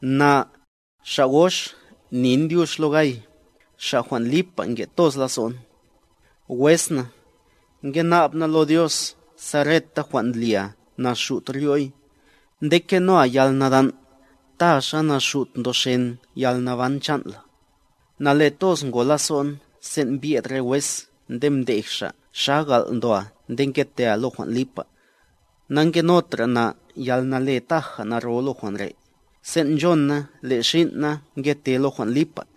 Na, xa' gox, nin dyux lo Gay, xa' jwan' lipa nke' toz lazo'n. Wes na, ngena'b na lo Dios sa reta jwan' ndlia naxut ryo'y, nde kenoa yalnadan', ta xa naxut ndoxen yalnaban chan' la. Nale toz ngo lazo'n sen' mbyed re wes nde mdej xa' xa gal' ndoa nde ngetea lo jwan' lipa. Nangenotra na yalnale taja naro lo jwan' re', sen' nchon na le' xin' na ngete lo jwan' lipa.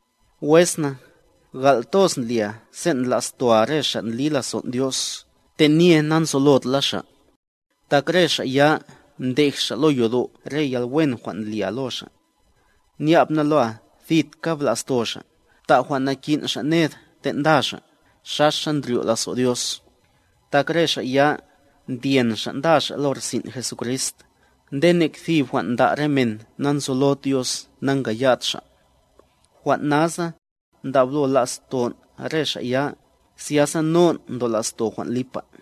Wes na, gal' toz ndlia sen' ndla'stoa re xa' ndli lazon' Dios, tenye nanzolot la xa'. Tak re xa' ya, mdej xa' lo yodo' re yalwen jwan' ndlia lo xa'. Nya'b na loa thitka bla'sto xa', bta' jwan' nakin' xa' ned ten' nda xa', xaxa ndryo' lazo' Dios. Tak re xa' ya, ndyen xa' nda xa' lo rsin' Jesucrist, nde nek thib jwan' nda' re men na'nzolod Dios nankaya'd xa'. Jwan' nasa, ndablo laston' re xa' ya, zyasa non' ndola'sto jwan' lipa.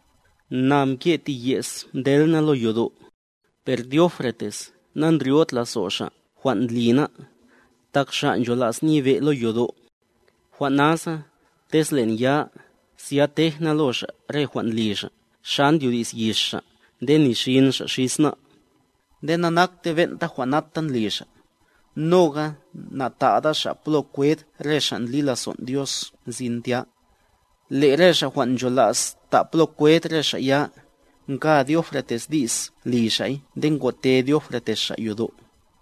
Na mke' ti ye's mtel na lo yodo', per Diótrefes na'ndryo'd lazo' xa' jwan' ndli ná', tak xa' nchola's nyebe' lo yodo'. Jwan' nasa, tez le'n ya, zya tej na lo xa' re jwan' ndli xa', xa ndyodi's yix xa' nde ni xin xa' xis ná'. Nde nanakte ben'ta jwan' nata ndli xa', noga na'ta'da xa' plo kwed re xa' ndli lazon' Dios nzin tya. Le' re xa' jwan' ncholas ta' plo kwed re xa' ya, nka Diótrefes di's li xa'y nde ngote Diótrefes xa' yodo'.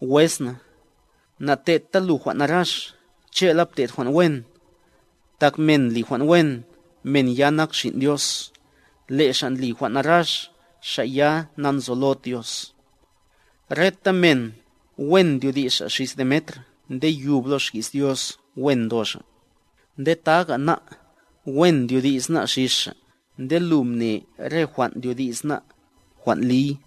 Wes na, na'te'dta lu jwan' narax, che'la pte'd jwan' wen. Tak men ndli jwan' wen, men ya nak xin' Dios, le' xa' ndli jwan' narax, xa' ya nanzolod Dios. Reta men, wen ndyodi's xa' xis Demetr nde yub lo xki's Dios wen ndo xa'. Nde taga ná', wen ndyodi's ná' xis xa', nde lu mne le' re jwan' ndyodi's ná', jwan' liy.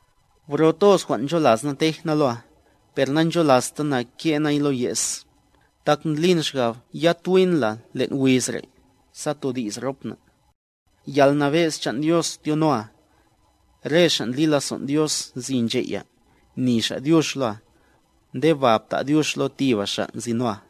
Bro toz jwan' ncholas na tej na loa, per na'ncholasta na ke' nay lo ye's, tak ndlin xgab yatwi'n la len' wiz re', sa todi's rop na'. Yalnabe'z chan' Dios tyonoa. Re xa' ndli lazon' Dios nzi nche' ya, ni xa' dyux loa. Nde ba bta' dyux lo tiba xa' nzinoa.